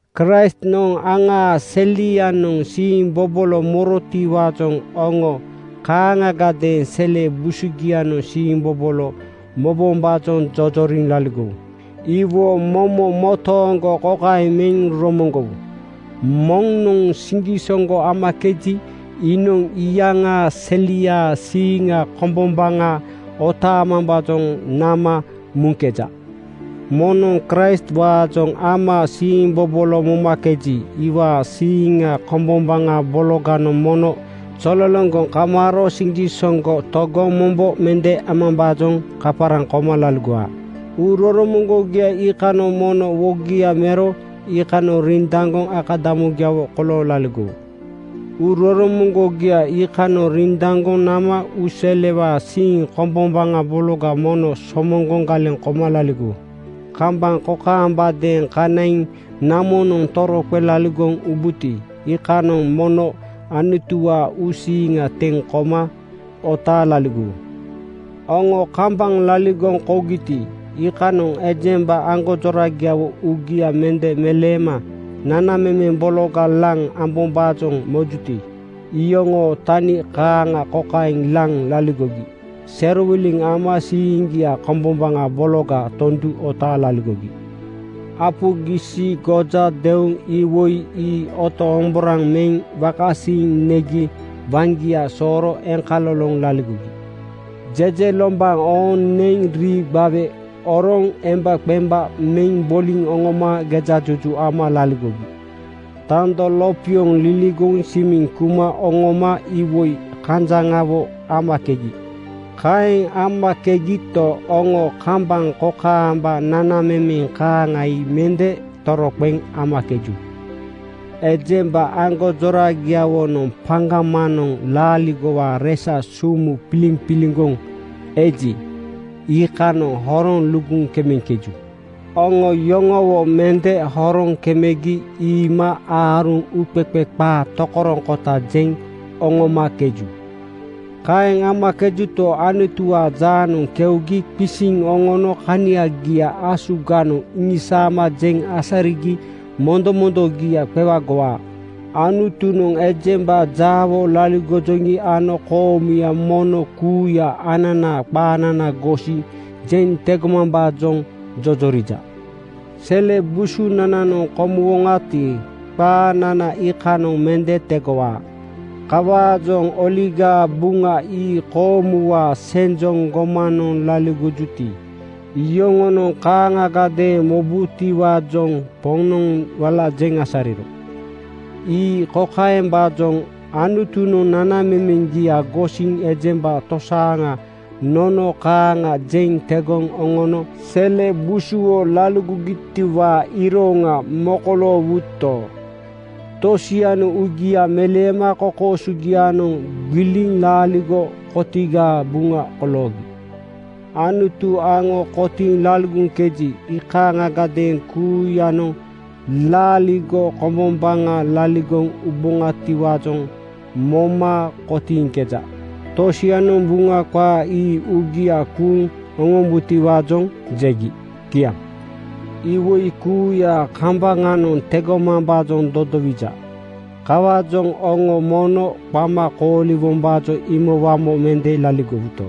Kraistnoŋ aŋaa selianoŋ siimbobolo morotiwaajoŋ oŋo kaaŋagadeeŋ sele busugianoŋ siimbobolo mobombaajoŋ jojoriŋ laligowu. Iwo momo motooŋgo kokaeŋ meŋ romoŋgowu: Moŋnoŋ siŋgisoŋgo amakeji, iinoŋ iyaŋaa seliaa siiŋa kombombaŋa otaamambaajoŋ nama muŋkeja. Moŋnoŋ Kraistwaajoŋ ama siimbobolo momakeji, iwaa siiŋa kombombaŋa bologanoŋ mono zololoŋgoŋ kamaaro siŋgisoŋgo togoŋ mombo mende amamambaajoŋ kaparaŋ koma laligowaa. Uuroromoŋgogia iikanoŋ mono wogia mero iikanoŋ rindaŋgoŋ akadamugiawo kolooŋ laligowu. Uuroromoŋgogia iikanoŋ rindaŋgoŋ nama uuselewaa siiŋ kombombaŋa bologa mono somoŋgoŋ galeŋ koma laligowu. Kambaŋ kokaambadeeŋ kanaiŋ namonoŋ toroqeŋ laligoŋ ubuti, iikanoŋ mono Anutuwaa uusiiŋa teŋ koma otaaŋ laligowu. Oŋo kambaŋ laligoŋ kougiti, iikanoŋ ejemba aŋgonjoragiawo uugia mende meleema nanamemeŋ bologa laŋ ambombaajoŋ mojuti, iyoŋoo tani kaaŋa kokaeŋ laŋ laligogi: Serowiliŋ ama siiŋgia kombombaŋa bologa tondu otaaŋ laligogi. Apu gisi (marihuana), goja deuŋ iwoi ii otoŋomboraŋ meŋ wakasiiŋ negi waŋgia sooro eŋkaloloŋ laligogi. Jejelombaŋ ooŋ neŋ rii gbawe oroŋ embaqemba meŋ boliŋ oŋoma gejajuju ama laligogi. Tando lopioŋ liligoŋ simiŋ kuma oŋoma iwoi kanjaŋawo amakegi. Kaeŋ amakegito, oŋo kambaŋ kokaamba nanamemeŋ kaaŋa ii mende toroqeŋ amakeju. Ejemba aŋgonjoragiawonoŋ paŋgamanoŋ laaligowaa resa sumu piliŋpiliŋgoŋ eji, iikanoŋ horoŋ luguŋ kemeŋkeju. Oŋo yoŋowo mende horoŋ kemegi iima aaruŋ uuqeqe qaa tokoroŋkota jeŋ oŋomakeju. Kaeŋ amakejuto, Anutuwaa jaanoŋ keugi qisiŋ oŋono kaniagia asuganoŋ isaama jeŋ asarigi mondomondogia qewagowaa. Anutunoŋ ejemba jaawo laligojoŋi ano koomuya mono kuuya ananaa qaanana gosiŋ jeŋ tegomambaajoŋ jojorija. Sele busunananoŋ komuwoŋati, qaanana iikanoŋ mende tegowaa. Kawaajoŋ Oligaa Buŋa ii koomuwaa senjoŋ gomanoŋ laligojuti, iyoŋonoŋ kaaŋagadeeŋ mobutiwaajoŋ Poŋnoŋ wala jeŋ asariro. Ii kokaembaajoŋ: Anutunoŋ nanamemeŋgia gosiŋ ejemba tosaaŋa nono kaaŋa jeŋ tegoŋ oŋono sele busuwo laligogitiwaa iroŋa mokoloowuto, tosianoŋ uugia meleema kokoosogianoŋ gbiliŋ laaligo kotigaa buŋa koloogi. Anutu aŋo kotiiŋ laligoŋkeji, iikaaŋiadeeŋ kuuyanoŋ laaligo kombombaŋa laligoŋ ubutiwaajoŋ moma kotiiŋkeja. Tosianoŋ Buŋa qaa ii uugia kuuŋ oŋombutiwaajoŋ jegi. Kiaŋ. Iwoi kuuyaa kambaŋanoŋ tegomambaajoŋ dodowija. Kawaajoŋ oŋo mono qama kooliwombaajoŋ imowamo mende laligowuto,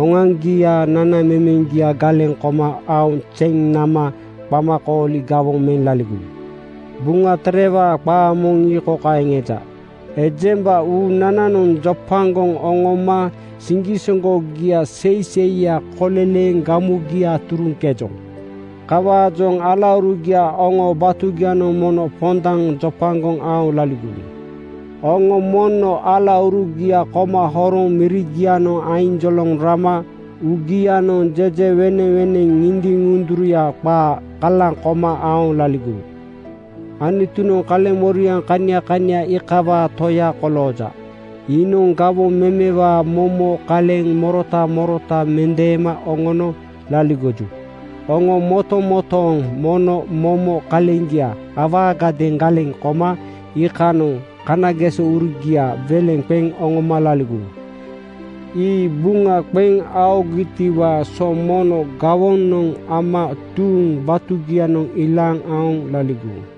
oŋoaŋgiaa nanamemeŋgia galeŋ koma aoŋ zeŋ nama qamakooli gawoŋ meŋ laligowu. Buŋa Terewaa qaa moŋ ii kokaeŋ eja, “Ejemba uunananoŋ jopagoŋ oŋoma siŋgisoŋgogia seiseiya koleleeŋ gamugia turuŋkejoŋ.” Kawaajoŋ alaurugia oŋoo batugianoŋ mono pondaŋ jopagoŋ aoŋ laligowu. Oŋo mono alaurugia koma horoŋ mirigianoŋ ainjoloŋ rama uugianoŋ jejeweneŋweneŋ ŋindiŋ-ŋunduruya qaa kalaŋ koma aoŋ laligowu. Anutunoŋ kaleŋmoriaŋ kania kania iikawaa Toya kolooja. Iinoŋ gawoŋ memewaa momo kaleŋ morota morota mendeema oŋono laligoju. Oŋo motomotooŋ mono momo kaleŋgia awaagadeeŋ galeŋ koma iikanoŋ kanagesourugia weleŋ qeŋ oŋoma laligowu. Ii buŋa qeŋ aogitiwaa so mono gawonoŋ ama tuuŋ batugianoŋ ilaaŋ aoŋ laligowu.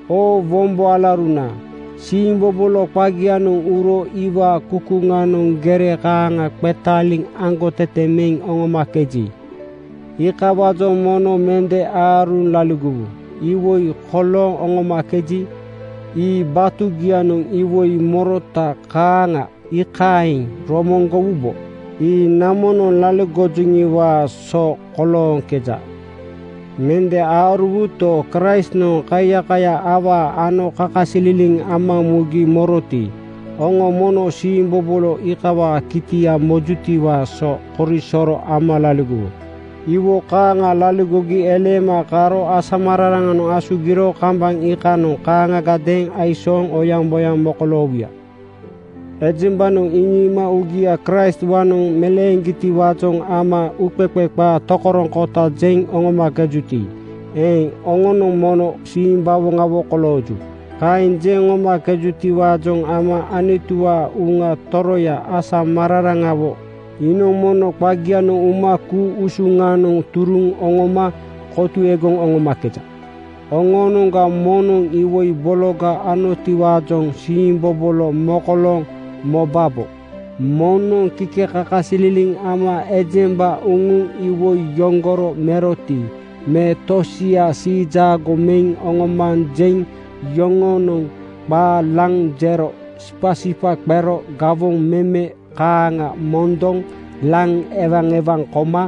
Oo wombo alauruna, siimbobolo qagianoŋ uro iwaa kukuŋanoŋ gere kaaŋa qetaaliŋ aŋgotete meŋ oŋomakeji, iikawaajoŋ mono mende aaruŋ laligowu. Iwoi kolooŋ oŋomakeji, ii batugianoŋ iwoi morota kaaŋa, iikaeŋ romoŋgowubo. Ii namonoŋ laligojoŋiwaa so kolooŋkeja. Mende aaruwuto, Kraistnoŋ kaiyaka awaa ano kakasililiŋ ama mugi moroti, oŋo mono siimbobolo iikawaa kitia mojutiwaa so korisoro ama laligowu. Iwo kaaŋa laligogi eleema karo asamararaŋanoŋ asugiro kambaŋ iikanoŋ kaaŋagadeeŋ aisooŋ oyaŋboyaŋ mokoloowuya. Ejembanoŋ iŋiima uugia Kraistwaanoŋ meleeŋgitiwaajoŋ ama uuqeqe qaa tokoroŋkota jeŋ oŋomakejuti eeŋ, oŋonoŋ mono simbawoŋawo kolooju. Kaeŋ jeŋ oŋomakejutiwaajoŋ ama Anutuwaa Uŋa Toroya asamararaŋawo iinoŋ mono qagianoŋ uma ku-usuŋanoŋ turuŋ oŋoma kotuegoŋ oŋomakeja. Oŋoonoŋga moŋnoŋ iwoi bologa anotiwaajoŋ siimbobolo mokolooŋ mobabo. Moŋnoŋ kikekakasililiŋ ama ejemba uŋuŋ iwoi yoŋgoro meroti me tosia siijaago meŋ oŋomanjeŋ yoŋoonoŋ qaa laŋ jero sipasipa qero gawoŋ meme kaaŋa mondoŋ laŋ ewaewaŋ koma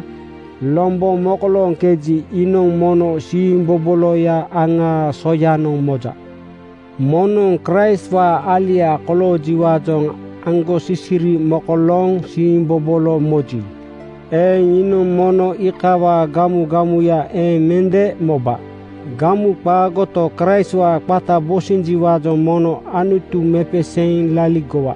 lombo mokolooŋkeji, iinoŋ mono siimboboloya aŋaa soyanoŋ moja. Moŋnoŋ Kraistwaa alia koloojiwaajoŋ aŋgosisiri mokolooŋ siimbobolo moji eeŋ, iinoŋ mono iikawaa gamugamuya eeŋ mende moba. Gamu qaagoto, Kraistwaa qata bosinjiwaajoŋ mono Anutu mepeseeŋ laligowa.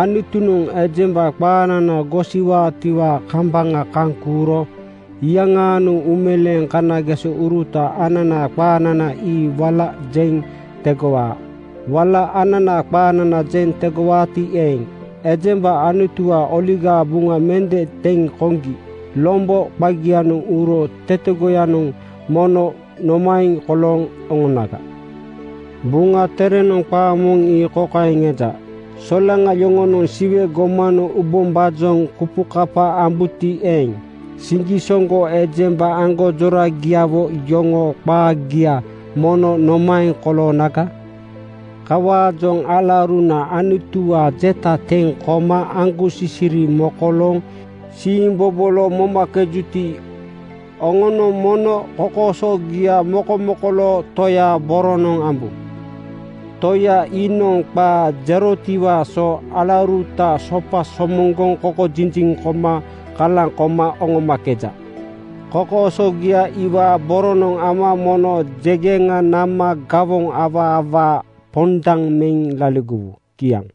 Anutunoŋ ejemba qaanana gosiwaatiwaa kambaŋa kaŋ kuuro iyaŋaanoŋ uumeleeŋ kanagesouruta ananaa qaanana ii wala jeŋ tegowaa. Wala ananaa qaanana jeŋ tegowaati eeŋ, ejemba Anutuwaa Oligaa Buŋa mende teŋ koŋgi lombo qagianoŋ uro tetegoyanoŋ mono nomaeŋ kolooŋ oŋonaga? Buŋa Terenoŋ qaa moŋ ii kokaeŋ eja: “Solaŋa yoŋonoŋ Siwe gomanoŋ ubombaajoŋ kupukapa ambuti eeŋ, siŋgisoŋgo ejemba aŋgonjoragiawo yoŋoo qaagia mono nomaeŋ koloonaga?” Kawaajoŋ alauruna Anutuwaa jeta teŋ koma aŋgosisiri mokolooŋ siimbobolo momakejuti, oŋonoŋ mono kokoosogia mokomokoloo Toyaa boronoŋ ambu. Toya iinoŋ qaa jerotiwaa so alauruta sopa somoŋgoŋ kokojiji koma kalaŋ koma oŋomakeja. Kokoosogia iwaa boronoŋ ama mono jegeŋa nama gawoŋ awaa awaa pondaŋ meŋ laligowu. Kiaŋ.